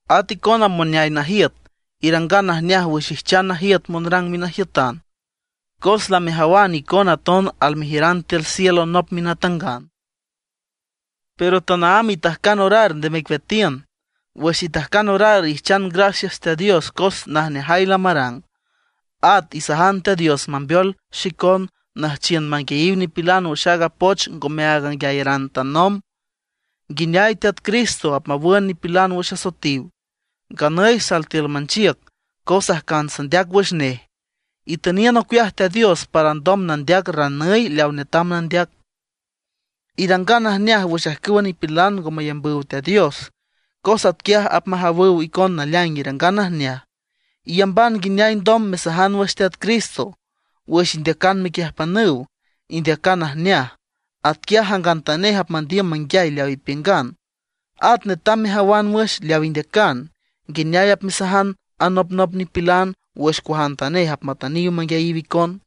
At icona moneay najiüt, irangan najneaj wüx ijchan najiüt monrang minajiütan, cos lamejawan icona aton almejiüran tiül cielo nop minatangan. Pero tanaámb itajcan orar nde mecueatiün. Wüx itajcan orar ijchan gracias Teat Dios cos najneajay lamarang. At isajan Teat Dios mambeol xicon nüjchiün manguiayiw nipilan wüx aaga poch ngomeaag anguiayaran tanomb, nguineay Teat Cristo apmawün nipilan wüx asoetiw. Nganüy sal tiül manchiüc cos ajcan sandeac wüx nej. Itüniün ocueaj Teat Dios para alndom nandeac ranüy leaw netam nandeac. Irangan najneaj wüx ajcüwa nipilan ngo mayambüw Teat Dios, cos atquiaj apmajawüw icon naleaing irangan najneaj. Iyamban nguineay alndom mesajan wüx Teat Cristo. Wüx indeacan mequiüjpanüw, indeacan najneaj; atquiaj jangantanej apmandiüm manguiay leaw ipiüngan. At netam mejawan wüx leaw indeacan, nguineay apmesajan anopnop nipilan wüx cuajantanej apmatüniw manguiayiw icon.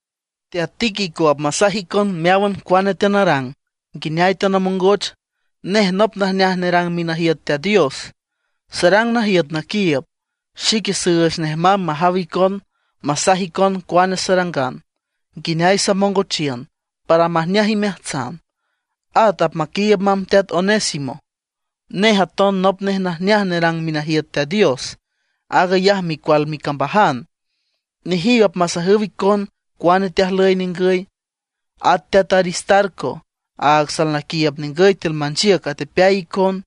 Teat Tíquico apmasaj icon meáwan cuane teanarang, nguineay teanamongoch. Nej nop najneaj nerang minajiüt Teat Dios, sarang najiüt naquiiüb. Xique süüch nej mamb majaw icon masaj icon cuane sarangan, nguineay samongochiün, para majneaj imeajtsan. At apmaquiiüb mamb teat Onésimo; nej aton nop nej najneaj nerang minajiüt Teat Dios. Aag ayaj micual micambajan. Nejiw apmasajüw icon cuane teajlüy ningüy. At teat Aristarco, áag salnaquiiüb ningüy tiül manchiüc atepeay icon.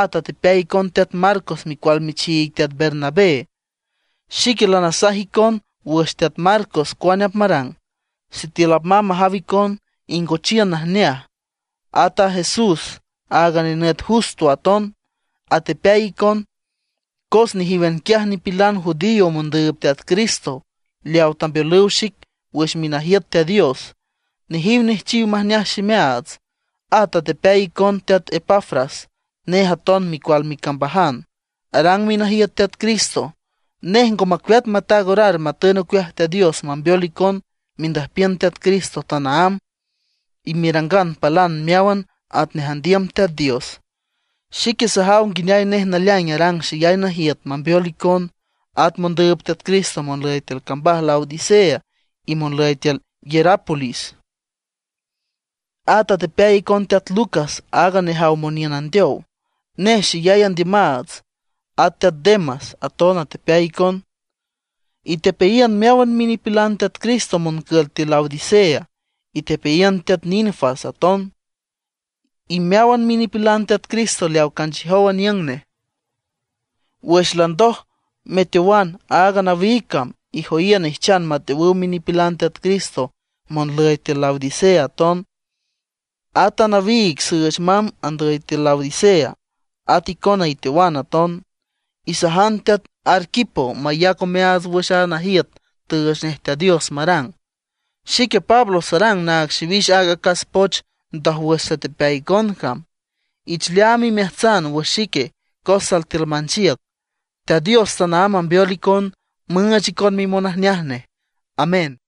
At atepeay icon teat Marcos micual michiig teat Bernabé. Xique lanasaj icon wüx teat Marcos cuane apmarang. Sitiül apmamb majaw icon, ingochiün najneaj. At a Jesús, áag nenüt Justo aton, atepeay icon. Cos nejíwan quiaj nipilan judío mondüüb Teat Cristo leawa tambeolüw xic wüx minajiüt Teat Dios; nejiw nejchiw majneaj ximeaats. At atepeay icon teat Epafras. Nej aton micual micambajan, arang minajiüt Teat Cristo. Nej ngo macueat mataag orar matün ocueaj Teat Dios mambeol icon mendüjpiün Teat Cristo tanaámb, y merangan palan meáwan atnej andiüm Teat Dios. Xique sajaw nguineay nej naleaing arang xeyay najiüt mambeol icona, at mondüüb Teat Cristo monlüy tiül cambaj Laodicea, y monlüy tiül Hierápolis. At atepeay icon teat Lucas, aaga nejaw moniün andeow, nej xeyay andiümaats. At teat Demas aton atepeay icon. Itepeayiün meáwan minipilan Teat Cristo moncül tiül Laodicea. Itepeayiün teat Ninfas aton, y meáwan minipilan Teat Cristo leawa canchiüjow aniüng nej. Wüx landoj meteowan aaga nawiig cam, ijoyiün ijchan mateowüw minipilan Teat Cristo monlüy Laodicea aton. At a nawiig süüch mamb andüy tiül Laodicea, at icona iteowan aton. Isajan teat Arquipo mayac omeaats wüx aaga najiüt tüüch nej Teat Dios marang. Xique Pablo sarang naag xiwix aaga acas poch ndójwüx satepeay icon cam. Ich leaam imeajtsan wüx xique cos sal tiül manchiüc. Teat Dios tanaámb mambeol icon, müüch icon mimonajneaj nej. Amén.